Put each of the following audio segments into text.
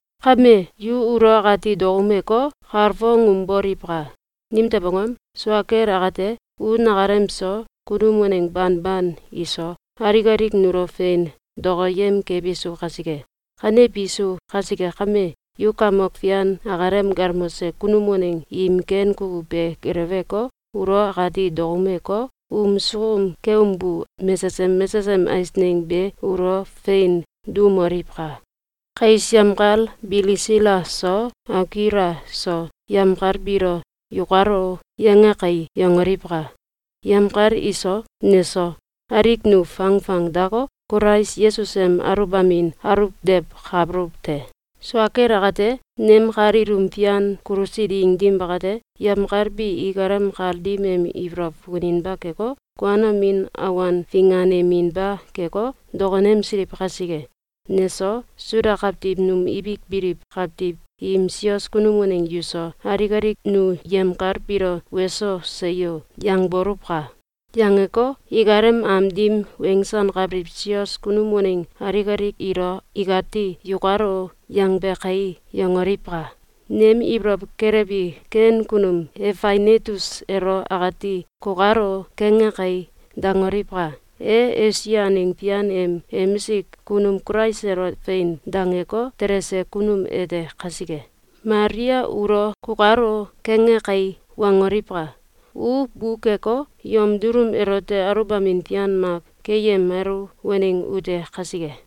Kame, yu ulo akati dokoumeko, kalfongumboliwka! Nimtew angom? Sua kel akate, u nakalem so, kunum waneng banban iso, alik alik nulo fein dokoyem kebisu kasike. Kanebisu kasike kame, yu Kamok Fian akalem galmose kunum waneng im ken kukuw be geleweko, ulo akati dokoumeko, um sukum keumbu mesesem mesesem eisneng be ulo fein duumoliwka! Kais yemkal Bilisila so, Akuila so, yemkal biilo “‘Yukalo!’, yange kai!”, yangoliwka! Yemkal iso, neso, alik nu fangfangdako, Kulais Yesus em aluwbamin aluwdewkabuluw te. Sua kel akate, nem kal ilum fian kulusi ding dim bakate, yemkal bi ikalem kal dim em ibolow fukuninba keko, kuanomin awan finganeminba keko, dokonemsiliw kasike, neso, Suda kawtiw num ibik biliw kawtiw im sios kunum waneng yuso, alik alik nu yemkal biilo “Weso! Seyo!”, yangboluwka! Yangeko, ikalem am dim wensankabiliw sios kunum waneng alik alik ilo ikati “‘Yukalo!’, yangbe kai!”, yangoliwka! Nem ibolow kelewbi ken kunum Efainetus elo akati “‘Kukalo!’, kange kai!”, dangoliwka! E Esia aneng fian em emisik kunum Kulais elo “Fein!”, dangeko, telese kunum ete kasike. Malia ulo “‘Kukalo!’, kange kai!”, wangoliwka! U bukeko, yom dulum elote aluwbamin fian mak keyemalu waneng ute kasike.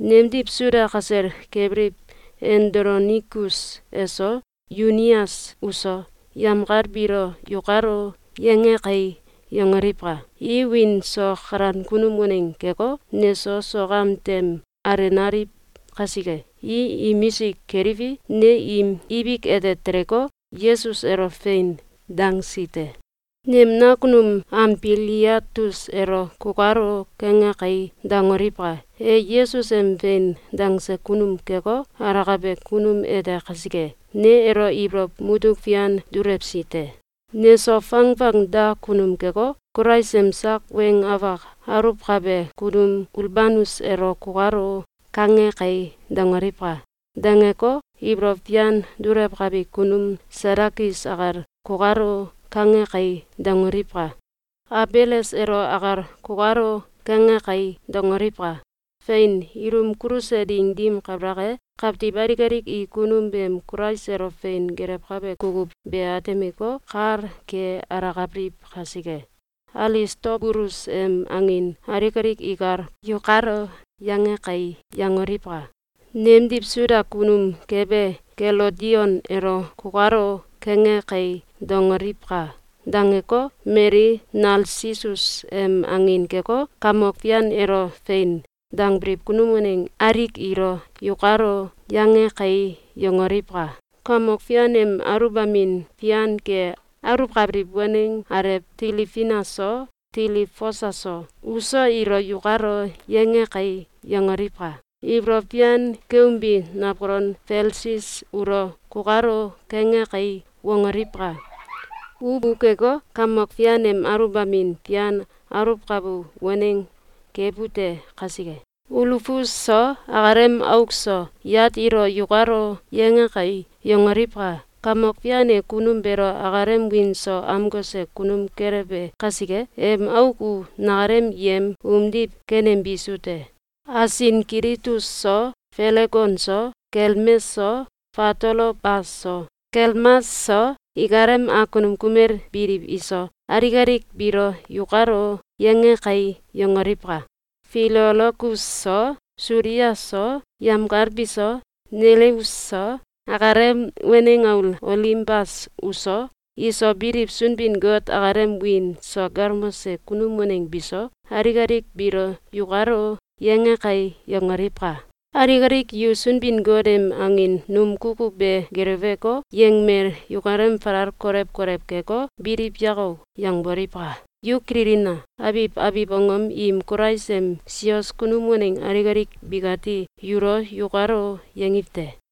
Nemdiw Suda kasel kebiliw Andolonikus eso, Yunias uso, yemkal biilo “‘Yukalo!’, yange kai!”, yangoliwka! I wiin so kalan kunum waneng keko, neso sok am tem alenaliw kasike. I imisik keliwi, ne im ibik ete teleko, Yesus elo “Fein!”, dangsi te. Nem nakunum Amfiliatus elo “‘Kukalo!’, kange kai!”, dangoliwka! E Yesus em “Fein!”, dangse kunum keko, alakabe kunum ete kasike, ne elo ibolow mutuk fian dulewsi te. Neso fangfang da kunum keko, Kulais em sak weng afak aluwkabe kunum Ulbanus elo “‘Kukalo!’, kange kai!”, dangoliwka! Dangeko, ibolow fian dulewkabi kunum Satakis akal “‘Kukalo!’, kange kai!”, dangoliwka! Abeles elo akal “‘Kukalo!’, kange kai!”, dangoliwka! Fein! Ilum kuluse ding dim kabalak e, kawtiw alik alik i kunum beem Kulais elo fein gelewkabe kukuw be atemeko, kal ke alakabiliw kasike. Alistobulus em angin alik alik ikal “‘Yukalo!’, yange kai!”, yangoliwka! Nemdiw Suda kunum kebe Kelodion elo “‘Kukalo!’, kange kai!”, dangoliwka! Dangeko, mali Nalsisus em angin keko, Kamok Fian elo “Fein!”, dangbiliw kunum waneng alik ilo “‘Yukalo!’, yange kai!”, yangoliwka! Kamok Fian em aluwbamin fian ke aluwkabiliw waneng alew Tilifina so, Tilifosa so, uso ilo “‘Yukalo!’, yange kai!”, yangoliwka! Ibolow fian keumbi nawkolon Felsis ulo “‘Kukalo!’, kange kai!”, wangoliwka! U bukeko, Kamok Fian em aluwbamin fian aluwkabu waneng kebute kasike. Ulufus so, akalem auk so, yat ilo “‘Yukalo!’, yange kai!”, yangoliwka! Kamok Fian e kunum beelo akalem wiin so amkose kunum kelewe kasike. Em auk u nakalem yem umdiw kenembisu te. Asinkilitus so, Felegon so, Kelmes so, Fatolobas so, Kelmas so, ikalem awkunum kumel biliw iso, alik alik biilo “‘Yukalo!’, yange kai!”, yangoliwka! Filologus so, Sulia so, yemkal biso, Neleus so, akalem waneng aul Olimbas uso, iso biliw Sunbin-Got akalem wiin so galmose kunum waneng biso, alik alik biilo “‘Yukalo!’, yange kai!”, yangoliwka! Alik alik yu Sunbin-Got em angin num kukuw be geleweko, yengimel yukalem falal kolew kolew keko, “Biliw yako!”, yangboliwka! Yu kililina! Abiw abiw angom im Kulais em sios kunum waneng alik alik bikati yulo “Yukalo!”, yangiw te.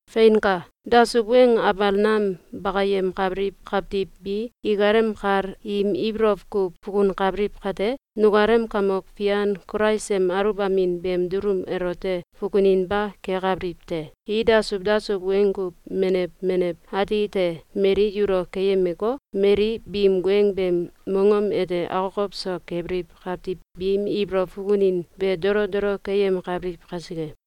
Feinka! Dasuw weng abal nam bakayemkabiliw kawtiw bi ikalem kal im ibolow kuw fukunkabiliw kate, nukalem Kamok Fian Kulais em aluwbamin beem dulum elote fukuninba kekabiliw te. I dasuw dasuw weng kuw menew menew ati te mali yulo keyemeko, mali biim weng beem mongom ete akokow so kebiliw kawtiw biim ibolow fukunin be dolo dolo keyemkabiliw kasike.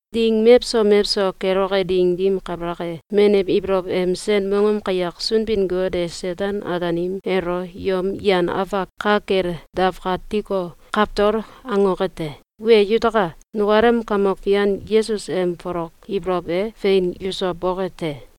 Ding mewso mewso keloke ding dim kabalak e, menew ibolow em sen mongom kayak Sunbin-Got e Seten-Ataanim elo yom yan afak ka kel dawkatiko, kawtol angoke te. Wee yutaka! Nukalem Kamok Fian Yesus em folok ibolow e fein yuso boke te!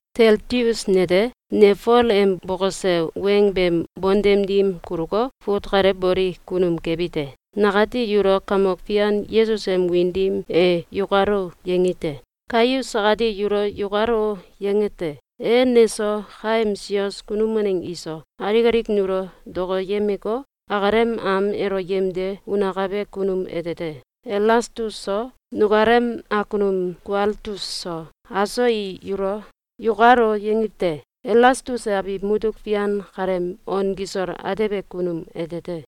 Teltius nete, ne Fol em bokose weng beem bontem dim kuluko, fut kale boli kunum kebi te. Nakati yulo Kamok Fian Yesus em wiin dim e “Yukalo!”, yangi te. Gaius akati yulo “Yukalo!”, yange te. E neso, kaem sios kunum waneng iso, alik alik nulo dokoyemeko, akalem am elo yemde unakabe kunum ete te. Elastus so, nukalem akunum Kualtus so, aso i yulo “Yukalo!”, yangiw te. Elastus e abiw mutuk fian kaleem on kisol atebe kunum ete te.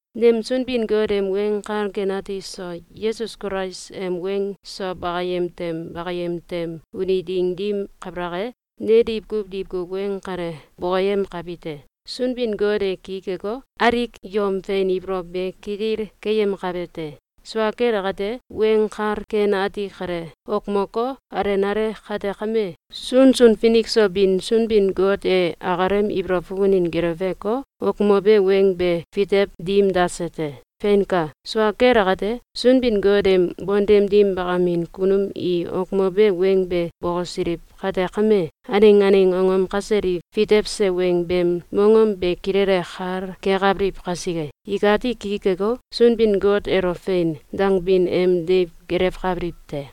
Nem Sunbin-Got em Weng Kal Ken Ati so Yesus Kulais em weng so bakayem tem bakayem tem uni ding dim kabalak e, ne diwkuw diwkuw weng kale bokoyemkabite: Sunbin-Got e ki keko, alik yom fein ibolow be kitil keyemkabe te. Sua kel akate, Weng Kal Ken Ati kale wokmoko, alenale kate kame, sunsun finik so bin Sunbin-Got e akalem ibolow fukunin geleweko, wokmobe weng be fitew dim dase te. Feinka! Sua kel akate, Sunbin-Got em bontem dim bakamin kunum i wokmobe weng be bokosiliw kate kame, aneng aneng angom kasel i fitewse weng beem mongom be kilele kal kekabiliw kasike, ikati ki keko, Sunbin-Got elo “Fein!”, dangbin em deiw gelewkabiliw te.